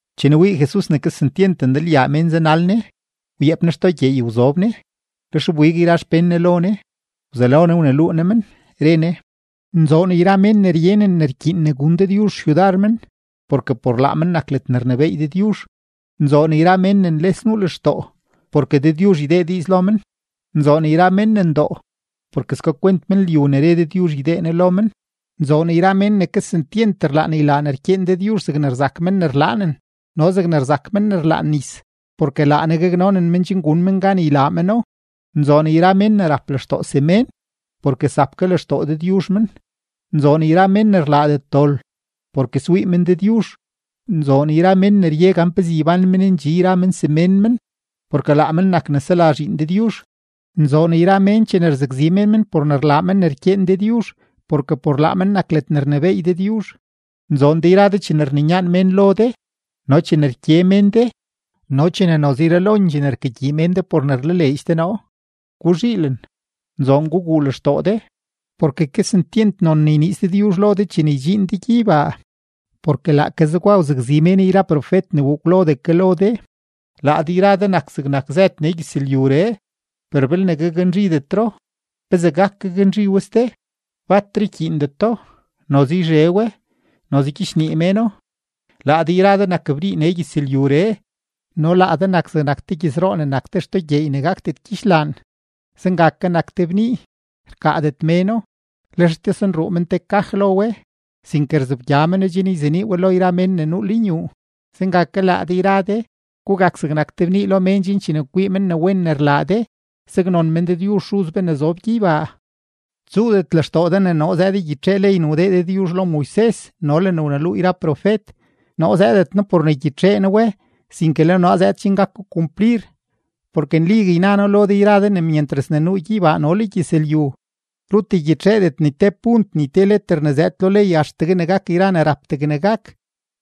Chene wii Jesus ne kesentyent ndalyaa mén zanal Ne, wyeep Ne xtoo gyeey wzob Ne. Lex wbig yra xpén Ne lo Ne, wzelo Ne wneluu Ne men, re Ne: ―Nzoon yra mén ne ryenen ne rkyiin ne gun Dëdyuzh xyudar men, porke por laa men nak ledne rnebééy Dëdyuzh. ’Nzoon yra mén ne nles nuu lextoo, porke Dëdyuzh ydee diiz lo men. ’Nzoon yra mén ne ndoo, porke skakwent men lyu ne re Dëdyuzh ydee Ne lo men. ’Nzoon yra mén ne kesentyent rlaan ylaa ne rkyeen Dëdyuzh zegne rzak men ne rlaanen no zegne rzak men ne rlaan nis, porke laa Ne gaknonen men chen gun men gan ylaa meno. ’Nzoon yra mén ne rap lextoo semén, porke zap ke lextoo Dëdyuzh men. ’Nzoon yra mén ne rlaadet dol, porke swii men Dëdyuzh. ’Nzoon yra mén ne rye gan pezee ybán men ndxi yra men semén men, porke laa men nak ne sela zhiin Dëdyuzh. ’Nzoon yra mén chene rzakzi mén men por ne rlaa men ne rkyeen Dëdyuzh, porke por laa men nak ledne rnebééy Dëdyuzh. ’Nzoon de yra de chene rninyaan mén lo de no chene rkye men de no chene noze yralondxee ne rkagyii men de por ne rlaleedx de noo. Guzhiilen, nzoon guguu lextoo de, porke kesentyent non ne yniiz Dëdyuzh lo de chene ydxiin de gyeybaa. Porke laake zegwa wzakzi mén yra profet ne wuu kwlodee ke lo de. ’Laa de yra de nak zegnak zëd nee gyëzlyuree; per belne gaknzhidetro, ¿pezee gak gaknzhi we ste? Batre ykyiindeto, noze yzhe we, noze gyichnii méno. ’Laa de yra de nak bnii nee gyëzlyuree. No laa de nak zegnak te gyëzroo ne nak te xtoo gyeey ne gakdet gyidxlaan. Zenga ke nak te bnii, rkaadet méno, lex ytosenruu men te kaj lo we, sinke rzobgya meno chen yzenii we lo yra mén ne nuu lenyuu. Zenga ke laa de yra de, gugak zegnak te bnii lo mén chen chene kwii mén ne wen rlaa de, saknon men Dëdyuzh Xuz be ne zob gyeybaa. ’Tsuudet lextoo de ne noo zëëd ygyitxee ley ne wdee Dëdyuzh lo Moises no le ne wneluu profet. Noo zëëdet noo por ne ygyitxee noo we, sinke le noo zëëd chen gako kumplir. Porke nligue yna noo lo de yra de ne myentras ne nuu gyeybaa no le gyëzlyu, rut ygyitxeedet ni te punt ni te leter ne zëëd lo ley axtegue ne gak yra ne rap degne gak.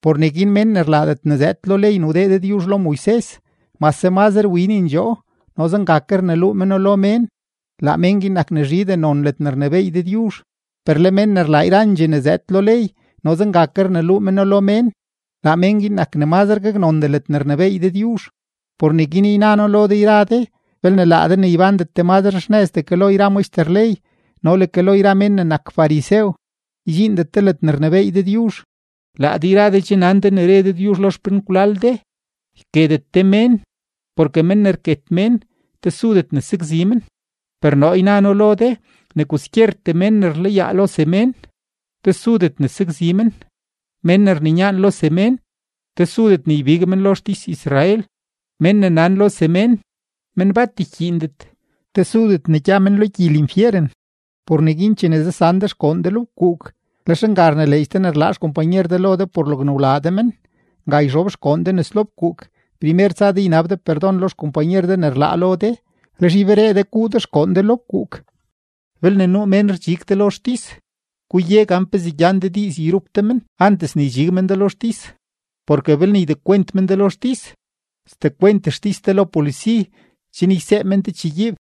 Por neguin mén ne rlaadet te ne zëëd lo ley ne wdee Dëdyuzh lo Moises, mase mazre winendxoo no zenga ke rneluu meno lo mén, laa mén guin zhindxee gaknon ledne rnebééy Dëdyuzh. Per le mén ne rlaa yrandxee ne zëëd lo ley no zenga ke rneluu meno lo mén, laa mén guin nak ne mazre gaknondee ledne rnebééy Dëdyuzh. Por neguin yna noo lo de yra de, belne laa de ne ybándet de mazre xnëzdee ke lo yra maxter ley no le ke lo yra men ne nak farisew, ydxiindet de ledne rnebééy Dëdyuzh. ’Laa de yra de che nan de ne re Dëdyuzh lo xpenkwlal de: “Yketet de mén, porke men ne rket mén tesudet ne sakzi men.” Per noo yna noo lo de ne kwaskyertee mén ne rlayaa lo semén, tesudet ne sakzi men; mén ne rninyaan lo semén, tesudet ne ybig men lo xtis-Israel; mén ne nan lo semén, “men bat rkyiindet”, tesudet ne gya men lo gyi linfyeren. ’Por neguin chene zasan de xgoon de lo fkuuk, lex nga rnileedx de ne rlaa xkompanyer de lo de por logne wlaa de men, nga yxob xgoon de nes lo fkuuk, primer tsa de ynab de perdon lo xkompanyer de ne rlaa lo de. Lex yberee de guu xgoon de lo fkuuk. ’Belne nuu mén rdxig de lo xtis, guye gan pezee gyan de diiz yrup de men antes ne ydxig men de lo xtis; porke belne ydekwent men de lo xtis, sdekwent xtis de lo polisi, chen ysee men de chegyiib.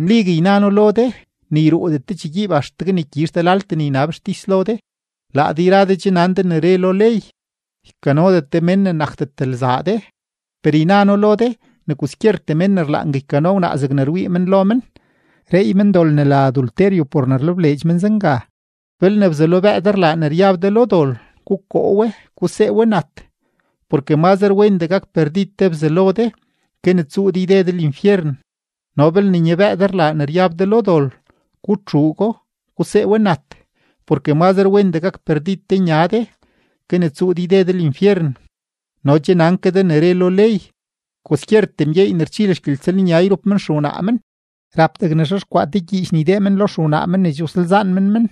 Nligue yna noo lo de, ne yruudet de chegyiib axtegue ne gyizh de laltee ne ynab xtis lo de. ’Laa de yra de che nan de ne re lo ley: “Ykanodet de mén ne nakdet lzaa de.” Per yna noo lo de ne kwaskyertee men ne rlaangue ykano wnaa zegne rwii men lo men, reey men dol ne la adulterio por ne rlebleedx men zenga. ’Belne bzalobëë de rlaa ne ryab de lo dol, gukoo we, gusee we nat. Porke mazre wendee gak perdid te bzalo de, ke ne tsuu de yde de linfyeren. No belne nyabëë de rlaa ne ryab de lo dol, gutxuugo, gusee we nat. Porke mazre wendee gak perdid te nya de, ke ne tsuu de yde de linfyeren. ’No che nan ke de ne re lo ley: “Kwaskyertee mgyeey ne rchil xgyeltsëlnya yrup men xewnaa men, rap degne xexkwaa te gyiich ydee men lo xewnaa men ne che wsalzaan men men.”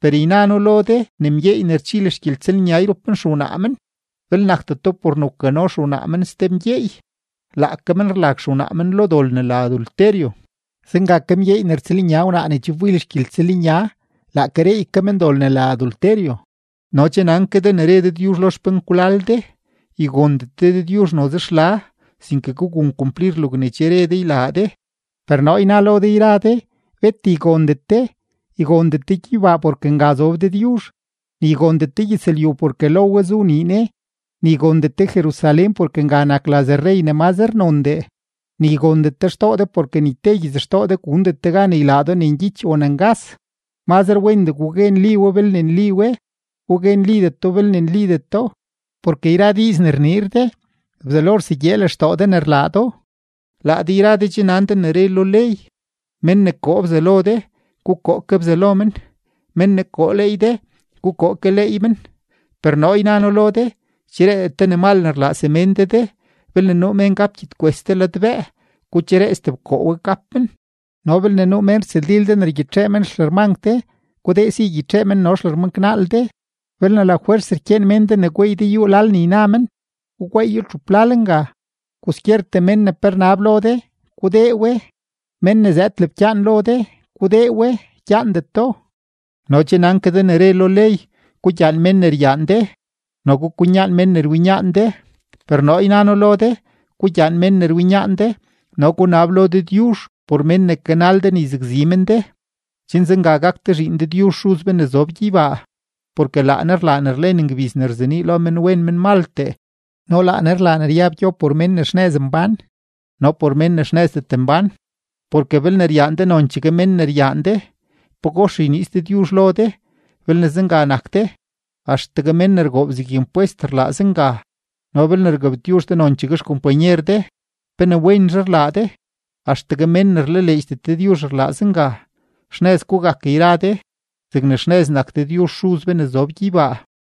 Per yna noo lo de ne mgyeey ne rchil xgyeltsëlnya yrup men xewnaa men, belne nakdeto por ne wkano xewnaa men ste mgyeey, laake men rlag xewnaa men lo dol ne la adulterio. Zenga ke mgyeey ne rtsëlnya wnaa ne che wbil xgyeltsëlnya, laake reey ke men dol ne la adulterio. ’No che nan ke de ne re Dëdyuzh lo xpenkwlal de: “Ygondet de Dëdyuzh noze xla, sinke gugun kumplir logne che re de ne ylaa de.” Per noo yna noo lo de yra de: Bet ygondet de, ygondet de gyeybaa porke nga zob Dëdyuzh, ni ygondet de gyëzlyu porke lo we zu nii Ne, ni ygondet de Jerusalén porke nga nak laz rrey ne mazre nondee, ni ygondet de xtoo de porke ni te gyitsxtoo de gundet de gan ylaa do ne ngyich o ne ngas. Mazdee gugue nli we belne nli we, gugue nlideto belne nlideto, porke yra diiz ne rniir de, Bzelo rsegyee lextoo de ne rlaa do. ’Laa de yra de che nan de ne re lo ley: “Mén ne koo bzalo de, gukoo ke bzalo men; mén ne koo leey de, gukoo ke leey men.” Per noo yna noo lo de: Ychereedet de ne mal ne rlaa semén de de; belne nuu mén gap gyedkwes de ladbëë, gucheree stebkoo we gap men. No belne nuu mén rtsëldil de ne rgyitxee men xlërmank de, gudee si ygyitxee men no xlërmanknaal de. Belne lafwers rkyeen mén de gweey de yúú lal ne yna men, gugweeyo txup lal nga. Kwaskyertee mén ne pe rnab lo de, gudee we; mén ne zëëd lebkyaan lo de, gudee we, gyaandet do. ’No che nan ke de ne re lo ley: “Gugyaan mén ne ryaan de, no gukwinyaan mén ne rwinyaan de.” Per noo yna noo lo de: Gugyaan mén ne rwinyaan de, no gunab lo Dëdyuzh por mén ne kanal de ne yzakzi men de, chen zenga gak de zhiin Dëdyuzh Xuz be ne zob gyeybaa; porke laa Ne rlaa ne rlen ngbiz ne rzenii lo menwen menmaltee no laa Ne rlaa ne ryab gyo por mén ne xnëz mbán no por mén ne xnëzdet mbán. Porke belne ryaan de nonchegue mén ne ryaan de, ¿pagox yniiz Dëdyuzh lo de belne zenga nak de? Axtegue men ne rgoob zeg impwest rlaa zenga. No belne rgabtyuzh de nonchegue xkompanyer de, ¿pe ne wenzhe rlaa de? Axtegue mén ne rlaleedxdet Dëdyuzh rlaa zenga. Xnëz gugak yra de zegne xnëz nak Dëdyuzh Xuz be ne zob gyeybaa.